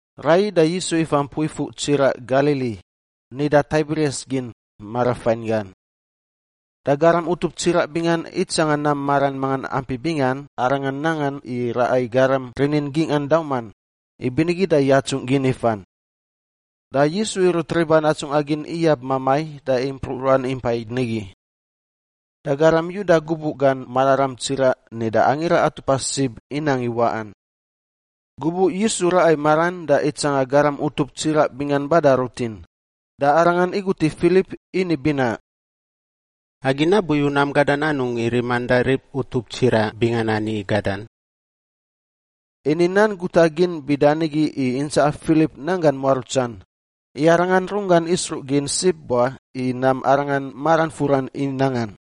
Raiyi da Yisu ifa mpui fuꞌ tsiraꞌ Galili, nida Taibirias gin, marafain gan. Da garam utup tsiraꞌ bingan itsanga nam maran mangan ampi bingan Arangan nangan i raꞌa i garam rini gingꞌan dauman, ibinigi da yatsungꞌ gin ifan. Da Yisu irut riban atsungꞌa gin iyab mamai da impruꞌ ruan impa nigi. Da garam Yuda gubuꞌ gan mararam tsiraꞌ nida Angira Atupa Sib inang i waꞌan. Gubuꞌ Yisu raꞌa i maran da itsanga garam utup tsiraꞌ bingan bada rutin, da Arangan igut i Filip ini binaꞌ, “Agi nabuyu nam gadan anungꞌ i riman da rib utup tsiraꞌ bingan ani i gadan?” Ini nan guta gin bida nigi i intsaꞌa Filip nanggan muarutsan, i Arangan runggan isruꞌ gin sib wa i nam Arangan maran furan i nangan.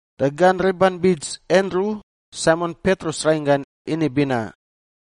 Da gan riban bits Andru, Saimon Petrus rainggan, ini binaꞌ,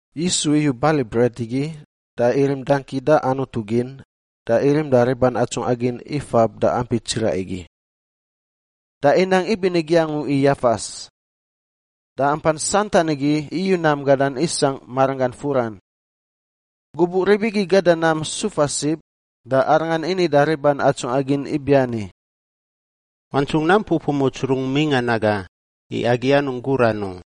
Yisu iyu bali bret igi da irim dangki da Anutu gin da irim da riban atsungꞌa gin ifab da ampi tsiraꞌ igi. Da inang ibinigi angu i yafas. Da ampan santan igi iyu nam gadan isangꞌ maranggan furan. Gubuꞌ rib igi gada nam sufa sib, da Arangan ini da riban atsungꞌa gin ibiani, “Wantsungꞌ nam pupumuts rungꞌ mingꞌan aga, i agi anungꞌ guran u.”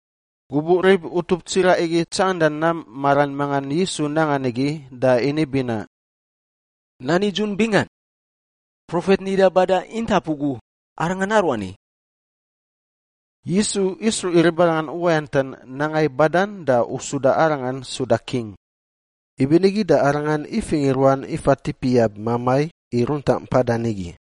Gubuꞌ rib utup tsiraꞌ igi tsanganda nam maran mangan Yisu nangan igi da ini binaꞌ, “Nan nidzun bingan! Profet nida bada intap ugu arangan aruani.” Yisu isruꞌ i ribarangan uwayantan nanga i badan da usuda Arangan suda king, ibinigi da Arangan ifingꞌ i ruan ifa tip iyab mamai i runtaꞌ mpadan nigi.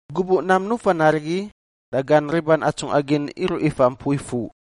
Gubuꞌ nam nufan arigi da gan riban atsungꞌa gin iruꞌ ifa mpui fuꞌ,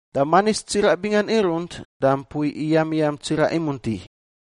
Da manis tsiraꞌ bingan irunt da mpui iyamiyam tsiraꞌ imunti.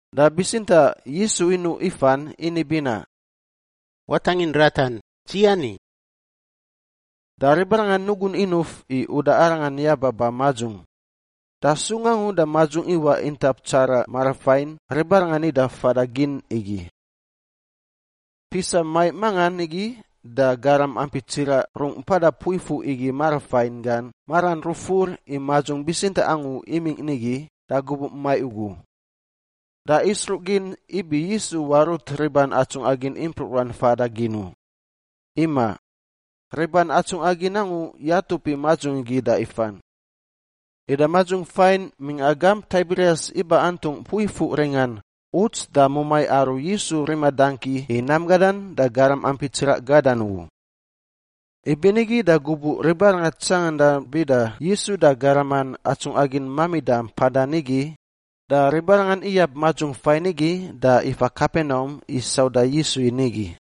Da bitsintaꞌ Yisu inuꞌ ifan ini binaꞌ, “Watangin ratan! Dzi ani.” Da ribarangan nugun inuf i uda Arangan yaba ba madzung, da sung angu da madzung iwaꞌ intap tsaraꞌ marafain ribarangan nida fada gin igi. Pisa maiꞌ mangan igi da garam ampi tsiraꞌ rungꞌ mpada mpui fuꞌ igi marafain gan maran rufur i madzung bitsintaꞌ angu imingꞌ nigi da gubuꞌ maiꞌ ugu. Da isruꞌ gin ibi Yisu warut riban atsungꞌa gin impruꞌ ruan fada gin u. Imaꞌ, riban atsungꞌa gin angu yatup i madzung igi da ifan. Ida madzung fain mingꞌa gamp Taibirias iba antungꞌ mpui fuꞌ ringan, uts da mumai aru Yisu rima dangki i nam gadan da garam ampi tsiraꞌ gadan ugu. Ibinigi da gubuꞌ ribarangan tsanganda bida Yisu da garaman atsungꞌa gin mamida mpadan nigi, da ribarangan iyab madzung fain igi da ifa Kapenaum i sauda Yisu i nigi.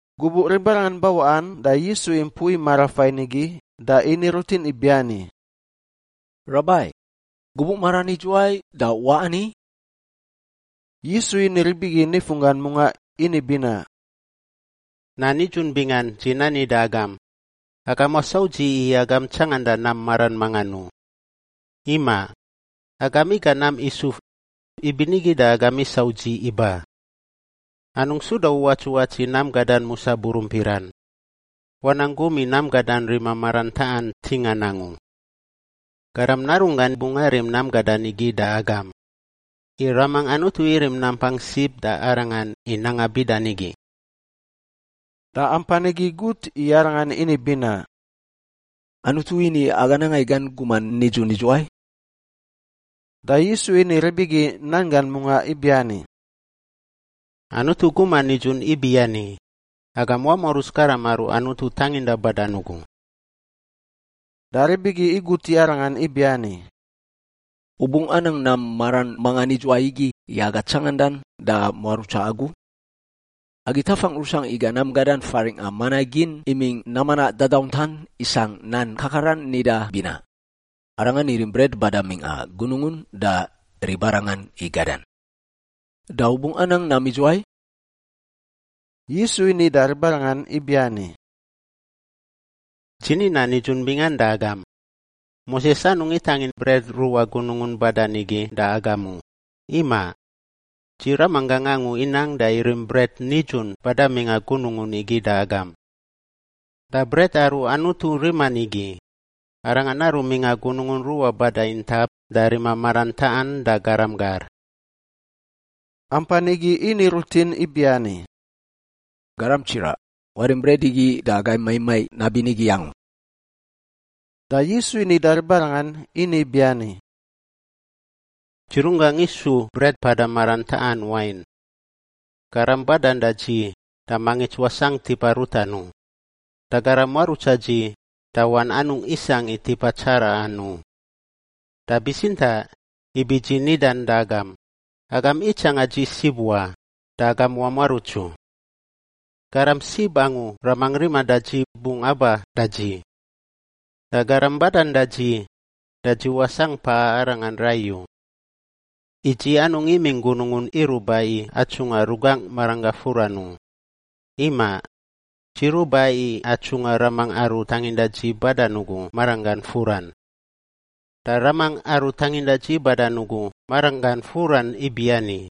Gubuꞌ ribarangan bawaꞌan da Yisu i mpui marafain igi da ini rutin ibiani, “Rabai, gubuꞌ maran idzuwai da u waꞌ ani?” Yisu ini rib igi nifunggan mungaꞌ ini binaꞌ, “Nan nidzun bingan dzi nani da agam, agam wasau dzi i agam tsanganda nam maran mangan u. Imaꞌ, agam iga nam isuf; ibinigi da agam isau dzi iba. Anungꞌ suda uwatsuwats i nam gadan musa burumpiran. Wanang gum i nam gadan rima maran taꞌan ntingan angu. Garam Narunggan bungꞌ arim nam gadan igi da agam, i Raman Anutu irim nampang sib da Arangan i nanga bida nigi.” Da ampan igi gut i Arangan ini binaꞌ, “Anutu ini aga nanga i gan guman nidzun idzuwai?” Da Yisu ini rib igi nan gan mungaꞌ ibiani, “Anutu guman nidzun ibiani: agam wamuaruts garam aru Anutu tanginda badan ugu.” Da rib igi igut i Arangan ibiani, “U bungꞌ anang nam maran mangan idzuwai igi i aga tsangandan da muarutsa agu? Agi tafangꞌ rusangꞌ iga nam gadan faringꞌa mana gin imingꞌ nam manaꞌ dadauntan isangꞌ nan kakaran nida binaꞌ, ‘Arangan irim bret bada mingꞌa gunungun da ribarangan i gadan.’ Da u bungꞌ anang nam idzuwai?” Yisu ini da ribarangan ibiani, “Dzi ni nan nidzun bingan da agam, Moses anungꞌ itangin bret ruꞌa gunungun badan igi da agam u, imaꞌ. Dzi Ramanggangꞌ angu inang da irim bret nidzun bada mingꞌa gunungun igi da agam. Da bret aru Anutu riman igi, arangan aru mingꞌa gunungun ruꞌa bada intap da rima maran taꞌan da garam gar.” Ampan igi ini rutin ibiani, “Garam Tsiraꞌ, warim bret igi da agai maiꞌ maiꞌ nabinigi angu.” Da Yisu ini da ribarangan ini biani, “Dzi runggangꞌ isu bret mpada maran taꞌan wain. Garam badan da dzi da mangits wasangꞌ tipa rutan u, da garam muarutsa dzi da wan anungꞌ isangꞌ i tipa tsaraꞌan u. Da bitsintaꞌ ibi dzi nidan da agam, agam itsanga dzi sib wa da agam wamuaruts u. Garam sib angu Ramangꞌ riman da dzi bungꞌ aba da dzi. Da garam badan da dzi, da dzi wasangꞌ paꞌa arangan rai u. I dzi anungꞌ imingꞌ gunungun iruꞌ ba i atsungꞌa rugangꞌ maranggangꞌ furan u. Imaꞌ, dzi ruꞌ ba i atsungꞌa Ramangꞌ aru tanginda dzi badan ugu maranggan furan. Da Ramangꞌ aru tanginda dzi badan ugu maranggan furan ibiani,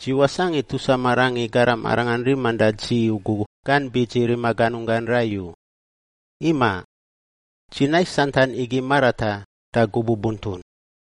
dzi wasangꞌ i tusa marangꞌ i garam Arangan riman da dzi ugu gan bits i rima ganunggan rai u. Imaꞌ, dzi nais santan igi marataꞌ da gubuꞌ buntun.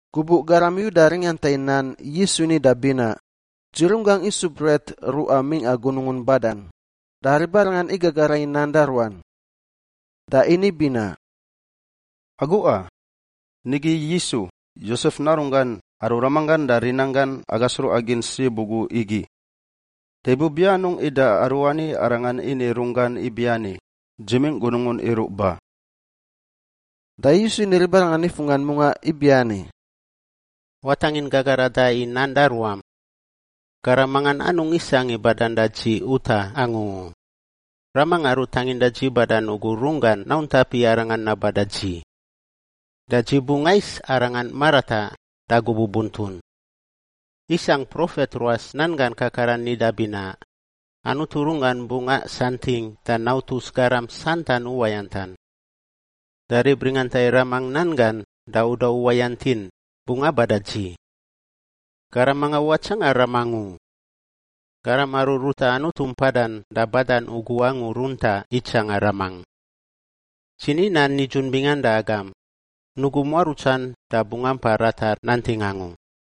Gubuꞌ garam Yuda ringanta i nan Yisu nida binaꞌ, “Dzi runggangꞌ isu bret ruꞌa mingꞌa gunungun badan,” da ribarangan igagara i nan da ruan. Da ini binaꞌ, “Aguꞌa! Nigi Yisu, Yosef narunggan, aru ramanggan da rinanggan aga sruꞌa gin sib ugu igi. Da ibubianungꞌ ida aruani arangan ini i runggan ibiani, ‘Dzi mingꞌ gunungun iruꞌ ba’?” Da Yisu ini i ribarangan nifunggan mungaꞌ ibiani, “Watangin gagarada i nan da ruam. Garam mangan anungꞌ isangꞌ i badan da dzi utaꞌ angu u; Ramangꞌ aru tanginda dzi badan ugu runggan nauntap i arangan naba da dzi. Da dzi bungꞌ ais arangan marataꞌ da gubuꞌ buntun. Isangꞌ profet ruas nan gan kakaran nida binaꞌ, ‘Anutu runggan bungꞌ asantingꞌ da nautus garam santan uwayantan.’ Da rib ringanta i Ramangꞌ nan gan da uda uwayant in, bungꞌ aba da dzi. Garam mangan watsanga Ramangꞌ u. Garam aru ruta Anutu mpadan da badan ugu angu runtaꞌ itsanga Ramangꞌ. Dzi ni nan nidzun bingan da agam, nugu muarutsan da bungꞌ ampa ratar nanting angu.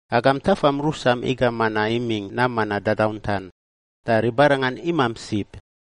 Agam tafam rusam iga mana imingꞌ nam manaꞌ dadauntan, da ribarangan imamp sib.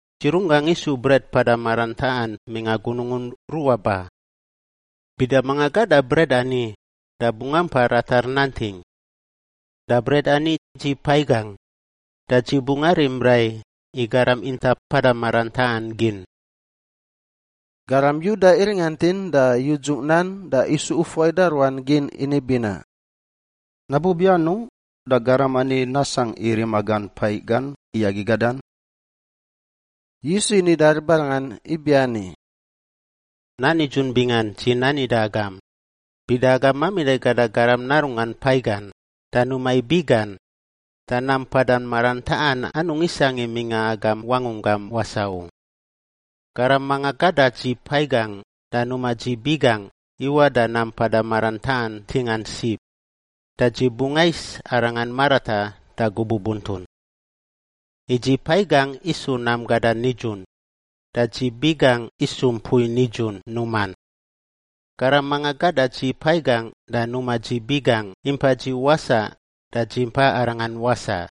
Dzi runggangꞌ isu bret mpada maran taꞌan mingꞌa gunungun ruꞌa ba. Bida manga gada bret ani da bungꞌ ampa ratar nanting. Da bret ani dzi paiꞌ gangꞌ, da dzi bungꞌ arim rai i garam intap mpada maran taꞌan gin.” Garam Yuda iringantin da yudzungꞌ nan da isu ufuai da ruan gin ini binaꞌ, “Nabubi anungꞌ da garam ani nasangꞌ i rima gan paiꞌ gan i agi gadan?” Yisu ini da ribarangan ibiani, “Nan nidzun bingan dzi nani da agam, bida agam mamida i gada Garam Narunggan paiꞌ gan da numa i biꞌ gan, da nam mpada maran taꞌan anungꞌ isangꞌ i mingꞌa agam wangunggam wasaꞌ u. Garam manga gada dzi paiꞌ gangꞌ da numa dzi biꞌ gangꞌ iwaꞌ da nam mpada maran taꞌan ntingan sib, da dzi bungꞌ ais arangan marataꞌ da gubuꞌ buntun. I dzi paiꞌ gangꞌ isu nam gadan nidzun, da dzi biꞌ gangꞌ isu mpui nidzun numan. Garam manga gada dzi paiꞌ gangꞌ da numa dzi biꞌ gangꞌ impa dzi wasaꞌ, da dzi mpa arangan wasaꞌ.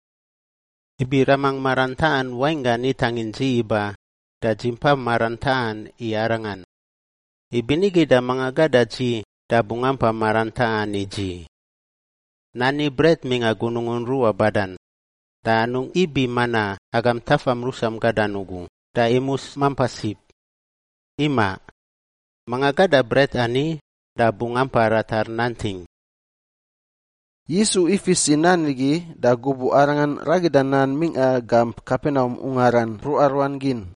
Ibi Ramangꞌ maran taꞌan wainggan itangin dzi iba da dzi impa maran taꞌan i Arangan, ibinigi da manga gada dzi da bungꞌ ampa maran taꞌan i dzi. Nani bret mingꞌa gunungun ruꞌa badan, da anungꞌ ibi mana agam tafam rusam gadan ugu da imus mampa sib. Imaꞌ, manga gada bret ani da bungꞌ ampa ratar nanting.” Yisu ifis i nan igi da gubuꞌ Arangan ragida nan mingꞌa gamp Kapenaum ungaran mpruꞌa ruan gin.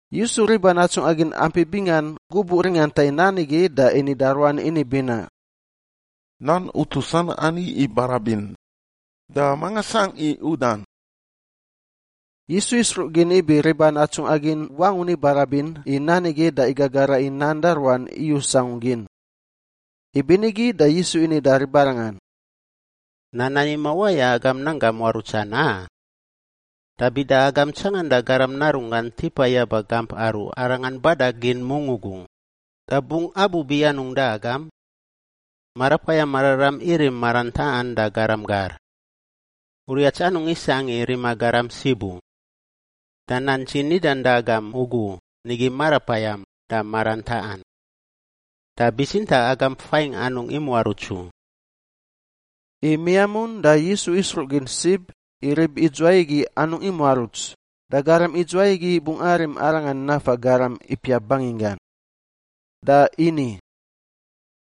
Yisu riban atsungꞌa gin ampi bingan gubuꞌ ringanta i nan igi da ini da ruan ini binaꞌ, “Nan utusan ani ibarabin. Da manga sangꞌ i udan?” Yisu isruꞌ gin ibi riban atsungꞌa gin wangun ibarabin i nan igi da igagara i nan da ruan iyus angu gin. Ibinigi da Yisu ini da ribarangan, “Nan ani mawaya agam nanggam muarutsan, a? Da bida agam tsanganda Garam Narunggan tipa yaba gamp aru Arangan bada gin mungꞌ ugu, da bungꞌ abubianungꞌ da agam? Marapayam Mararam irim maran taꞌan da garam gar. Uriats anungꞌ isangꞌ i rima garam sib u. Da nan dzi nidan da agam ugu nigi marapayam da maran taꞌan. Da bitsintaꞌ agam fain anungꞌ imuaruts u.” I miamun da Yisu isruꞌ gin sib i rib idzuwai igi anungꞌ imuaruts, da garam idzuwai igi bungꞌ arim Arangan nafa garam ipiap banginggan. Da ini,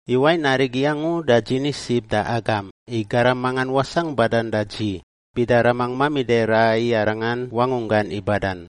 “I wain arigi angu da dzi ni sib da agam i garam mangan wasangꞌ badan da dzi, bida Ramangꞌ mamida i raꞌa i arangan wangunggan i badan.”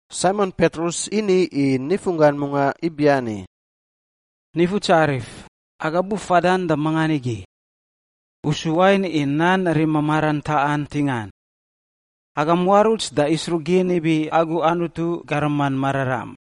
Saimon Petrus ini i nifunggan mungaꞌ ibiani, “Nifutsarif, aga bufadan da mangan igi? U su wain i nan rima maran taꞌan ntingan. Aga muaruts da isruꞌ gin ibi agu Anutu Garaman Mararam.”